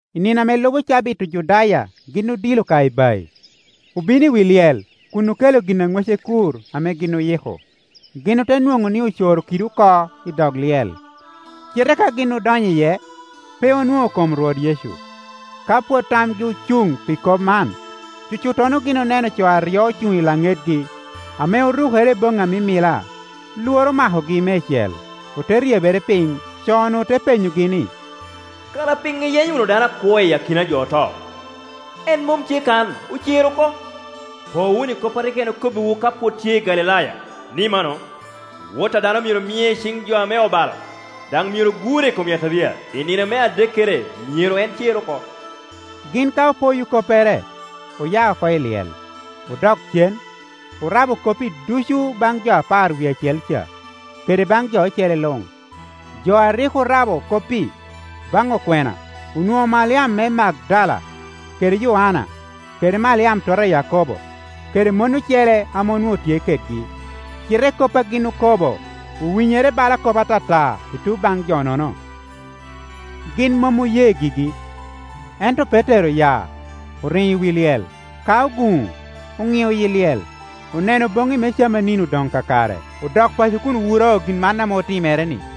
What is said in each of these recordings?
I nino ame lubo cabit Ojudaya gin odilo ka ibayi, obino i wi lyel kun okelo gin a ŋwece kur ame gin oyiko. Gin ote nwoŋo ni ocoro kidi oko i dog lyel; cite ka gin odonyo iye, pe onwoŋo kom Rwot Yecu. Ka pwod tamgi ocuŋ pi kop man, cucuttono gin oneno co aryo ocuŋ i laŋetgi, ame orukere i boŋŋi a mimila. Lworo omakogi meicel, ote ryebere piny. Co-nu te penyogi ni, “Kara piŋo iyenyo wunu dano akwo iyi akina a jo oto? [En mom tye kan, ocer oko.] Po wunu i kop a rik en okobbiwu ka pwod tye i Galilaya, ni mano, Wot a dano myero mie i ciŋ jo ame obalo, daŋ myero gure i kom yataria, i nino me adekkere myero en cer oko.” Gin ka opoyo koppere, oya oko i lyel, odok cen, orabo kop-pi ducu baŋ jo apar wie acel ca, kede baŋ jo ocele luŋ. Jo a rik orabo kop-pi baŋ okwena onwoŋo Maliam me Magdala, kede Yoanna, kede Maliam tota a Yakobo, kede mon ocele ame onwoŋo tye kedgi; cite kop a gin okobo owinyere bala kop atata i tuŋ baŋ jo-nono, gin mom oye gigi. [ Ento Petero oya, oriŋo i wi lyel; ka oguŋo, oŋio yi lyel, oneno boŋŋi me camanini odoŋ kakare, odok paco kun wuro gin man ame otimere-ni.]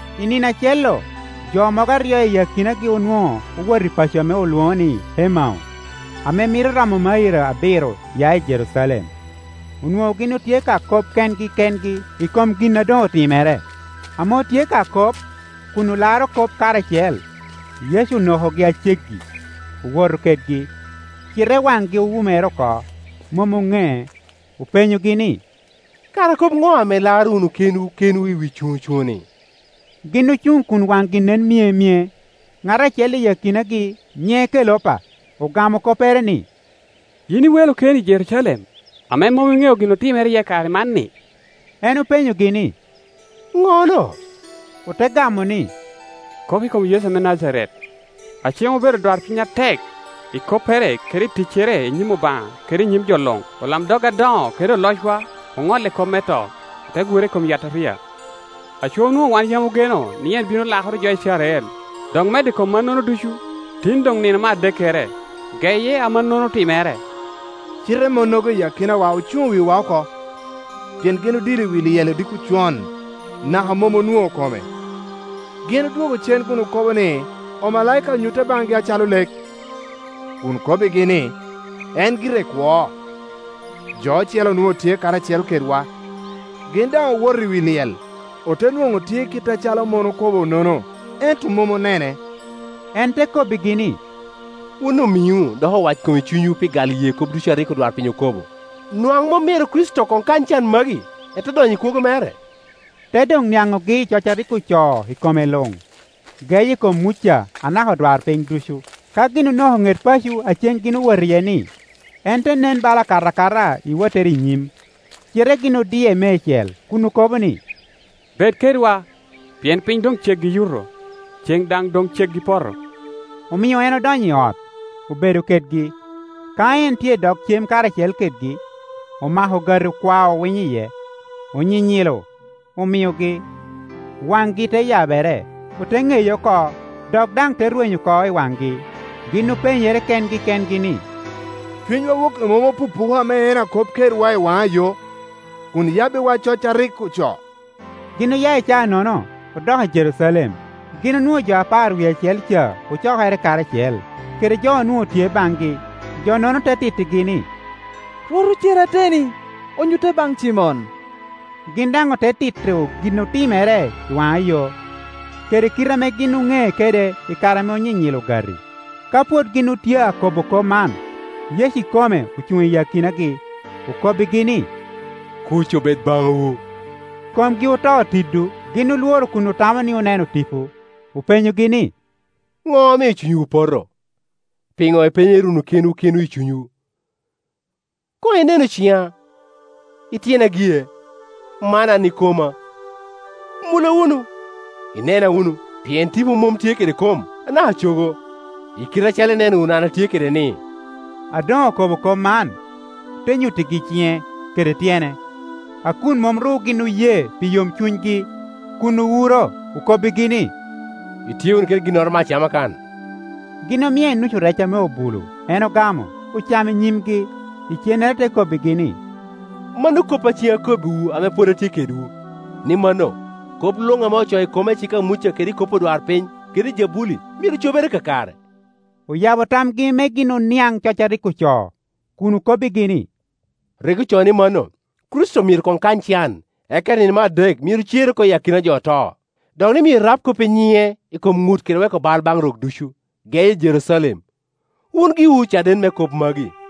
I nino acel-lu, jo mogo aryo i akinagi onwoŋo owot i paco ame olwoŋo ni Emau, ame mito romo mairo abiro ya i Jerucalem; onwoŋo gin otye ka kop kengi kengi i kom gin a doŋ otimere. Ame otye ka kop, kun olaro kop karacel, Yecu onokogi a ceggi, owoto kedgi. Cite waŋgi owumere oko, mom oŋee. Openyogi ni, “Kara kop ŋo ame ilaro wunu kenwu kenwu wi cuŋocuŋo-ni?” Gin ocuŋ kun waŋgi nen myemye. Ŋat acel i akinagi, nyiŋe Kelopa, ogamo koppere ni, “Yin i welo keni i Jerucalem, ame mom iŋeo gin otimere iye i kare man-ni?” En openyogi ni, “Ŋo-no?” Ote gamo ni, “Kop i kom Yecu me Najaret, a ceŋ obedo adwarpiny atek i koppere kede ticcere i nyim Obaŋa kede i nyim jo luŋ. Olamdog adoŋo kede olocwa oŋolle kop me to, ote gure i kom yataria. Aco onwoŋo wan yam ogeno ni en ame bino lakoro jo Icrael. Dok medo i kom mano ducu, tin doŋ nino me adekkere, geye a mannono otimere. Cite monnogo i akinawa ocuŋo wi wa oko, pien gin odilo i wi lyel odiko con, naka mom onwoŋo kome. Gin odwogo cen kun okobo ni, omalaika onyutte baŋgi acalo lek, kun kobbigi ni, en gire kwo. Jo ocele onwoŋo tye karacel kedwa, gin daŋ owoto i wi lyel, ote nwoŋo tye kit acalo mon okobo-nono, ento mom onene.” En te kobbigi ni, “Wun omiŋo, dok owackom i cunywu pi gal ye kop ducu a rik odwarpiny okobo! Nwaŋ mom myero Kricito koŋ kany can magi, ete donyo i kwogo mere?” Te doŋ niaŋogi i coc a rik ocoo i kome luŋ, geye i kom Muca naka odwarpiny ducu. Ka gin onoko ŋet paco a cen gin owot iye-ni, en te nen bala akato akata i wottere i nyim. Cite gin odie meicel kun okobo ni, “Bed kedwa, pien piny doŋ ceggi i yuto, ceŋ daŋ doŋ ceggi poto.” Omio en odonyo i ot, obedo kedgi. Ka en tye i dog cem karacel kedgi, omako ogati okwao winyo iye, onyinyilo, omiogi. Waŋgi te yabere, ote ŋeye oko; dok daŋ te rwenyo oko i waŋgi. Gin openyere kengi kengi ni, “Cunywa woki mom opupuka ame en akop kedwa i waŋa yo, kun oyabbiwa coc a rik ocoo?” Gin oya i caa-nono, odok i Jerucalem. Gin onwoŋo jo apar wie acel ca ocokere karacel, kede jo onwoŋo tye baŋgi. Jonono te tittigi ni, “Rwot ocer ateteni, onyutte baŋ Cimon!” Gin daŋ ote tito gin otimere i waŋayo, kede kite ame gin oŋee kede i kare ame onyinyilo ogati. Ka pwod gin otye akobo kop man, Yecu ikome ocuŋ i akinagi, [okobbigi ni, “Kuc obed baŋwu!”] Komgi oto tido, gin olworo kun otamo ni oneno tipo. Openyogi ni, “Ŋo omio cunywu opoto? Piŋo ipenyere wunu kenwu kenwu i cunywu? Koŋ inenu cina i tyena gie, man an ikoma. Mula wunu, inena wunu, pien tipo mom tye kede kom, anaka cogo, i kite acalo ineno wunu an atye kedeni.” [ A doŋ okobo kop man, te nyuttigi ciŋe kede tyene.] A kun mom ru gin oye pi yomcunygi, kun owuro, okobbigi ni, “Itye wunu kede ginnoro me acama kan?” Gin omie nucu rec ame obulo, en ogamo, ocamo i nyimgi. Icennere te kobbigi ni, “Mano koppa a ceŋ akobbiwu ame pwod atye kedwu, ni mano, kop luŋ ame ocoo i koma i cik a Muca kede i kop odwarpiny, kede ijabuli myero cobere kakare.” Oyabo tamgi me gin oniaŋ coc a rik ocoo, kun okobbigi ni, “Rik ocoo ni mano, Kricito myero koŋ kany can, eka i nino me adek myero cer oko iyi akina jo oto, dok ni, myero rab kop i nyiŋe i kom ŋut kede weko bal baŋ rok ducu, geye i Jerucalem. Wun giwu ocaden me kop magi.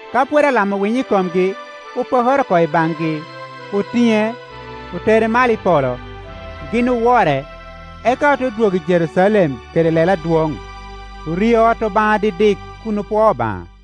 Ka pwod alamo winyo i komgi, opokere oko i baŋgi, otiŋe, otere malo i polo. Gin owore, eka ote dwogo i Jerucalem kede lelo adwoŋ, orio i ot Obaŋa dikdik kun opwoo Obaŋa.